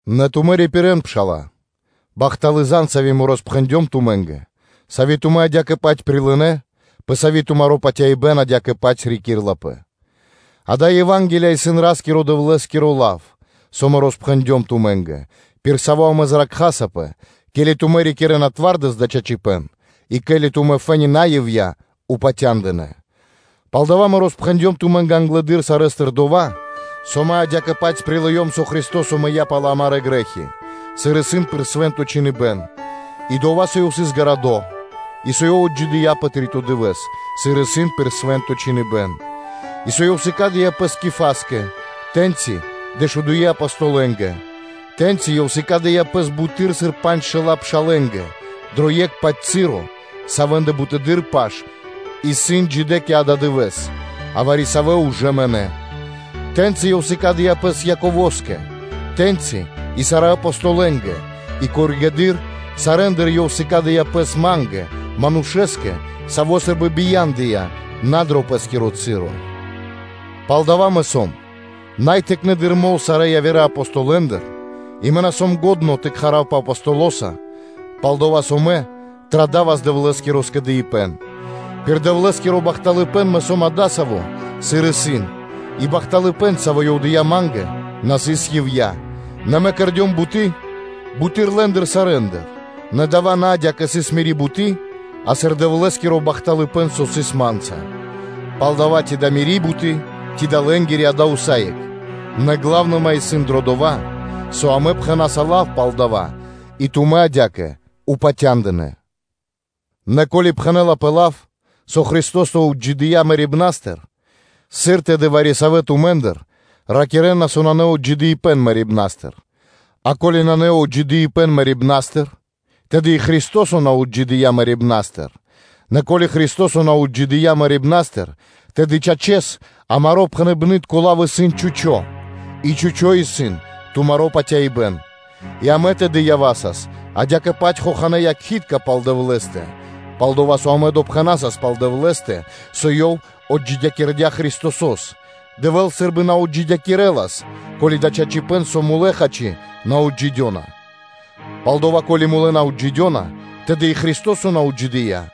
Нэ тумэ́ рипирэ́н, пшала́лэ, бахталы́ зан (звесь), сави́ мэ роспхэндём тумэ́нгэ, сави́ тумэ́ адя́кэ-паць прилынэ́, пэ сави́ тумаро́ патяибэ́н адя́кэ-паць рикирлапэ; дая́ Ева́нгелия исын Ра́скиро-Дэвлэ́скиро лав, со мэ роспхэндём тумэ́нгэ, пир саво́ амэ зракхасапэ, ке́ли тумэ́ рикирэ́на зоралэ́с дава́ чачипэ́н, и ко́ли тумэ́ фэ́ни на ивья́ (на напра́снэс) упатя́ндынэ. Палдава́ мэ роспхэндём тумэ́нгэ англэды́р сарэ́стыр дова́, со мэ адя́кэ-паць прилыём, со Христо́со мыя́ пал амарэ́ грэ́хи, сыр исын пир Свэ́нто Чхиныбэ́н; и дова́, со Ёв сыс ґарадо, и со Ёв отджидыя́ пэ три́то дывэ́с, сыр исын пир Свэ́нто Чхиныбэ́н; и со Ёв сыкадя́ пэс Кифаскэ, тэ́ньчи дэшудуе́ Апостолэнгэ. Тэ́ньци Ёв сыкадя́ пэс буты́р, сыр панджшэла́ пшалэ́нгэ дро екх-паць часо савэ́ндыр бутэды́р паш исын джидэ́ кэ ададывэ́с, а вари-савэ́ ужэ мынэ́. Тэ́ньци Ёв сыкадя́ Пэс Яково́скэ, тэ́ньчи и сарэ́ Апостолэнгэ; и коригэды́р (позжэды́р) сарэ́ндыр Ёв сыкадя́ Пэс ма́нгэ, манушэ́скэ, саво́ сы́рбы бия́ндыя на дро пэ́скиро часо. Палдава́ мэ сом най тыкнэды́р мол сарэ́ явирэ Апостолэндыр, и мэ на сом лачхо́ тэ кхаравпэ Апостолоса, пал-дова́ со мэ традавас Дэвлэ́скиро скэдыибэ́н. Пир Дэвлэ́скиро бахталыпэ́н мэ сом адасаво́, сыр исын, и бахталыпэ́н, саво́ Ёв дыя́ ма́нгэ, на сыс ивья́; нэ мэ кэрдём буты́ буты́р лэ́ндыр сарэ́ндыр; нэ дава́ на адя́кэ сыс мири́ буты́, а сыр Дэвлэ́скиро бахталыпэ́н, со сыс ма́нца. Палдава́, ци да мири́ буты́, ци да лэ́нгири, дава́ исын усае́кх, нэ главныма исын дро дова́, со амэ пхэна́са лав пал дава́, и тумэ́ адя́кэ упатя́ндынэ. Нэ ко́ли пхэнэ́лапэ лав, со Христо́со отджидыя́ мэрибна́стыр, сыр тэды вари-савэ́ тумэ́ндыр ракирэ́на, со нанэ отджидыипэн мэрибна́стыр. А ко́ли нанэ отджидыипэн мэрибна́стыр, тэды и Христо́со на отджидыя́ мэрибна́стыр: нэ ко́ли Христо́со на отджидыя́ мэрибна́стыр, тэды, чачэс, амаро́ пхэныбнытко лав исын чхучо́ (пусто), и чхучо́ исын тумаро́ патяибэ́н. И амэ тэды явасас адя́кэ-паць хоханэ́ якхи́тка пал Дэвлэ́стэ, пал-дова́ со амэ допхэнасас пал Дэвлэ́стэ, со Ёв отджидякирдя́ Христосо́с, Дэвэ́л сы́рбы на отджидякирэлас, ко́ли дава́ исын чачипэ́н, со мулэ́, хачи, на отджидёна. Палдава́ ко́ли мулэ́ на отджидёна, тэды и Христо́со на отджидыя́;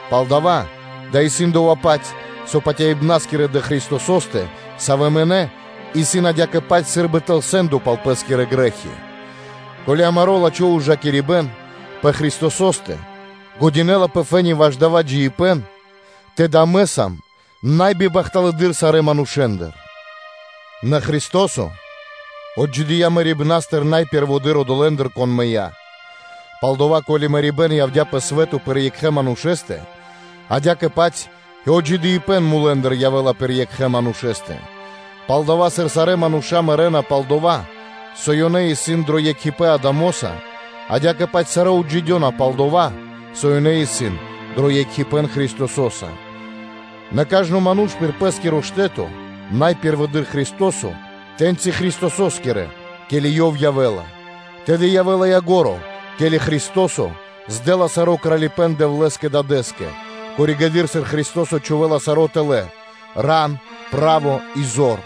Палдава́ дава́ исын дова́-паць, со патяибнаскирэ дрэ Христосо́стэ, савэ́ мынэ́, исын адя́кэ-паць сы́рбы тэл сэ́ндо пал пэ́скирэ грэ́хи. Ко́ли амаро́ лачхо́ ужакирибэ́н пэ Христосо́стэ исын лачхо́ фэ́ни ваш дава́ джиибэ́н, тэды амэ сам най бибахталэдыр сарэ́ манушэ́ндыр. Нэ Христо́со отджидыя́ мэрибна́стыр, са́мо пэ́рво одолэ́ндыр, кон мыя́. Палдава́, ко́ли мэрибэ́н явдя́ пэ свэ́то пир екхэ манушэ́стэ, адя́кэ-паць и отджидыипэн мулэ́ндыр явэ́ла пир екхэ манушэ́стэ. Палдава́, сыр сарэ́ мануша́ мэрэ́на пал дова́, со ёнэ исын дро екхипэ́н Адамоса, адя́кэ-паць сарэ́ отджидёна пал дова́, со ёнэ исын дро екхипэ́н Христосо́са. Нэ кажно ману́ш пир пэ́скиро штэ́то: англэды́р Христо́со, тэ́ньчи Христосо́скирэ, ке́ли Ёв явэ́ла. Тэды явэ́ла ко́нцо (яго́ро), ке́ли Христо́со здэла саро́ кралипэ́н Дэвлэ́скэ Дадэ́скэ; тэды, ке́ли, сыр Христо́со чхувэ́ла саро́ тэлэ́: ран, право и зор.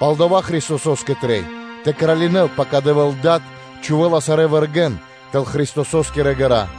Палдава́ Христосо́скэ трэй тэ кралинэ́л, пака Дэвэ́л Дад на чхувэ́ла сарэ́ вэргэ́н тэл Христосо́скирэ ґэра́,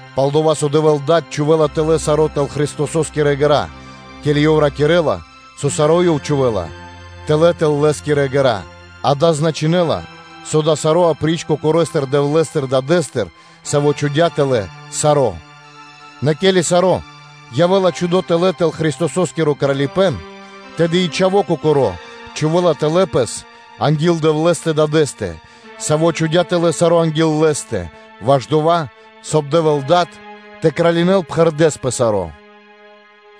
Пал-дова́ со Дэвэ́л Дад чхувэ́ла тэлэ́ саро́ тэл Христосо́скирэ ґэра́ (пирэ́), ке́ли Ёв ракирэ́ла, со “саро́ Ёв чхувэ́ла тэлэ́ тэл Лэ́скирэ ґэра́”, дава́ значынэ́ла, со дава́ саро́ апри́ч Кокорэстэ Дэвлэ́стэ Дадэ́стыр, Саво́ чхудя́ тэлэ́ саро́. Нэ ке́ли саро́ явэ́ла чхудо тэлэ́ тэл Христосо́скиро кралипэ́н, тэды и Чхаво́ Кокоро́ чхувэ́ла тэлэ́ Пэс анги́л Дэвлэ́стэ Дадэ́стэ, Саво́ чхудя́ тэлэ́ саро́ анги́л Лэ́стэ, ваш дова́, соб (кай) Дэвэ́л Дад тэ кралинэ́л пхэрдэ́с пэ саро́.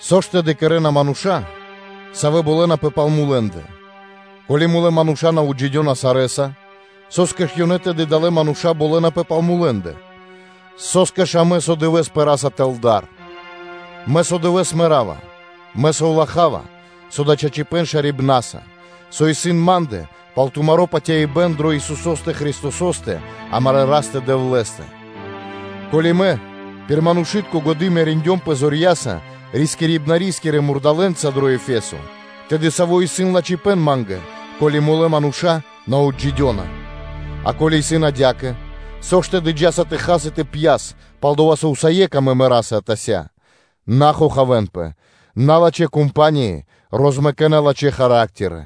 Со ж тэды кэрэ́на адалэ́ мануша́, савэ́ болэнапэ пал мулэ́ндэ? Ко́ли мулэ́ мануша́ на отджидёна сарэ́са, со́скэ ж ёнэ тэды далэ́ мануша́ болэнапэ пал мулэ́ндэ? Со́скэ ж амэ со дывэ́с пэраса тэл дар? Мэ со дывэ́с мэра́ва: мэ совлахава, со дава́ чачипэ́н шарибнаса, со исын ма́ндэ, пал тумаро́ патяибэ́н дрэ Исусо́стэ Христосо́стэ, амарэ́ Растэ-Дэвлэ́стэ. Ко́ли мэ пир манушы́тко годы́ мериндёмпэ зорья́са рискирибна́скирэ мурдалэ́нца дро Ефесо, тэды сави́ исын льго́та (ко́фо) ма́нгэ, ко́ли мулэ́ мануша́ на отджидёна? А ко́ли исын адя́кэ, со ж тэды джа́са тэ хас и тэ пьяс, пал-дова́ со усае́кх амэ мэраса атася́. На хохавэнпэ: налачхэ́ кампании розмэкэна лачхэ́ характеры.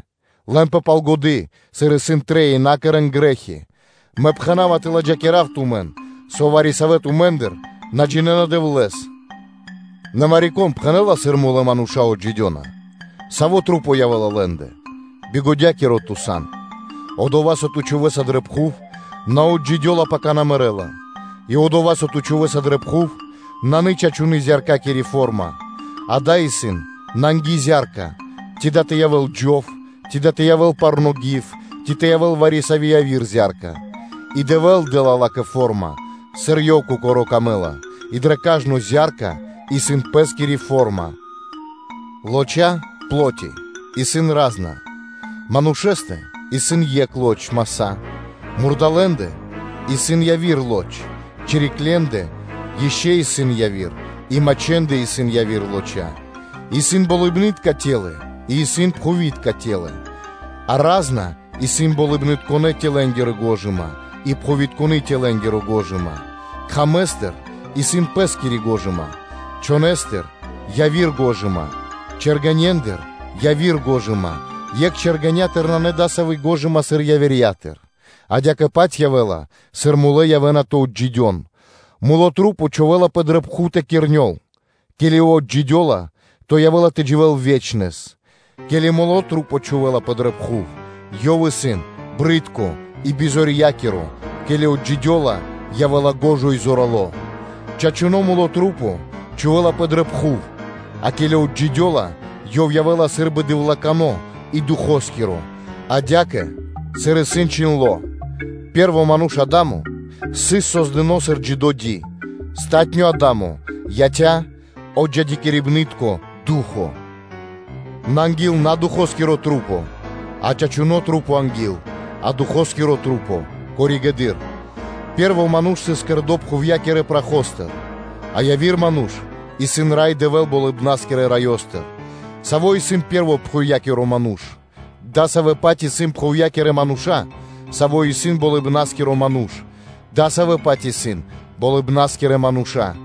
Лэнпэ пал годы́, сыр исын трэй и на кэрэ́н грэ́хи; мэ пхэна́ва тэ ладжакирав тумэн, со вари-савэ́ тумэ́ндыр на джинэ́на Дэвлэ́с. Нэ вари-кон пхэнэ́ла сыр мулэ́ мануша́ отджидёна? Савэ маса́ явэ́на лэ́ндэ? Бигодякиро ту сан: одова́, со ту чхувэ́са дрэ пхув, на отджидёла, пака на мэрэ́ла. И дова́, со ту чхувэ́са дрэ пхув, нанэ чачуны́ зя́рка, а дая́ исын нанги зя́рка: ци дава́ тэ явэ́л джов, ци дава́ тэ явэ́л парно́ гив, ци тэ явэ́л вари-сави́ яви́р зя́рка: и Дэвэ́л дэ́ла ла́кэ форма, сыр Ёв Кокоро́ камэ́ла, и дрэ кажно зя́рка исын пэ́скири форма. Лоча́ (пло́ти) исын ра́зна: манушэ́стэ исын екх лоч (маса́), мурдалэ́ндэ исын яви́р лоч, чириклендэ ишчо (инкэ́) исын яви́р лоч, и мачхэндэ исын яви́р лоч. И исын болыбны́тка формы и исын пхувитка формы, а ра́зна исын болыбнытконэ́-формэ́нгири го́жыма и пхувитконэ́-формэ́нгири го́жыма: кхамэстыр исын пэ́скири гожыма, чхонэстыр-яви́р гожыма, чэргэнендыр-яви́р гожыма: екх чэргэнятыр нанэ дасави́ гожыма, сыр явирьятыр. Адя́кэ-паць явэ́ла, сыр мулэ́ явэ́на тэ отджидён. Тру́по чхувэ́лапэ дрэ пхув тэ кирнёл, ке́ли ёв отджидёла, то явэ́ла тэ дживэ́л ве́чнэс. Ке́ли тру́по чхувэ́лапэ дрэ пхув, ёв исын джунгало́ (брыдко) и бизорья́киро, ке́ли отджидёла, явэ́ла шука́р и зорало́. Чачуно́ тру́по чхувэ́лапэ дрэ пхув, а ке́ли отджидёла, ёв явэ́ла сы́рбы дэвлыкано и Духоскиро. Адя́кэ, сыр исын чхиндло́: “Пэ́рво ману́ш Адамо сыс создыно́ сыр джидо́ ди, палатуно́ Адамо яця́ отджидякирибнытконэ духо́са.” Нэ анги́л на Ду́хо, а чачуно́ ману́ш, а Ду́хо коригэды́р (позжэ): пэ́рво ману́ш сыс создыно́ пхувья́кирэ прахостыр, а яви́р ману́ш исын Рай Дэвэ́л, Болыбна́скирэ Раёстыр. Саво́ исын пэ́рво пхувья́киро ману́ш, дасавэ́-паць исын пхувья́кирэ мануша́, саво́ исын Болыбна́скиро Ману́ш, дасавэ́-паць исын Болыбна́скирэ мануша́.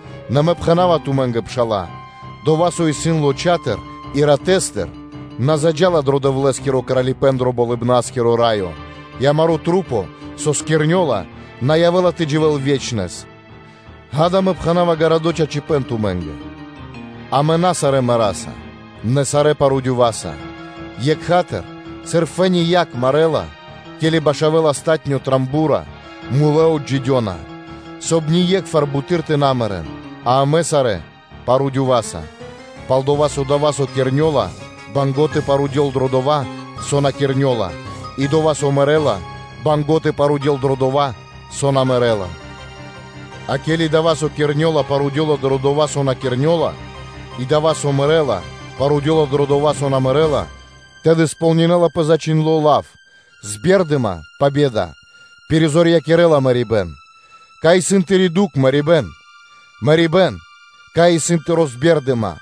Нэ мэ пхэна́ва тумэ́нгэ, пшала́лэ, дова́, со исын лоча́тыр и ратэ́стыр, на заджа́ла дро Дэвлэ́скиро Кралипэ́н дро Болыбна́скиро Раё; и амарэ́ маса́, савэ́ кирнёна, на явэ́на тэ дживэ́н ве́чнэс. Ѓа́да, мэ пхэна́ва чораханыбэн тумэ́нгэ: амэ на сарэ́ мэраса, нэ сарэ́ парудёваса, Екха́тыр, сыр фэ́ни якх марэла, ке́ли башавэла палатуно́ ро́го (горно), мулэ́ отджидёна, соб (кай) ние́кхвар буты́р тэ на мэрэ́н, а амэ сарэ́ парудёваса. Пал-дова́ со дова́, со кирнёла, исын банго́ (мусинэла) тэ парудёл дро дова́, со на кирнёла, и дава́, со мэрэ́ла, банго́ тэ парудёл дро дова́, со на мэрэ́ла. А ке́ли дава́, со кирнёла, парудёла дро дова́, со на кирнёла; и дава́, со мэрэ́ла, парудёла дро дова́, со на мэрэ́ла, тэды кэрэ́лапэ кэ ко́нцо/яго́ро (сполнинэлапэ) зачхиндло́ лав: “Збердыма (победа) пиризорьякирэла мэрибэ́н.” Кай исын тыри́ дукх, мэрибэ́н? Мэрибэ́н, кай исын тыри́ збердыма?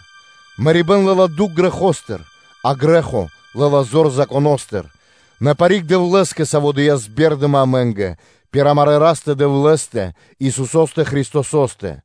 Мэрибэ́н лэ́ла дукх грэхостыр, а грэ́хо лэ́ла зор Законо́стыр; нэ парик Дэвлэ́скэ, Саво́ дыя́ збердыма амэ́нгэ пир амарэ́ Растэ-Дэвлэ́стэ, Исусо́стэ Христосо́стэ.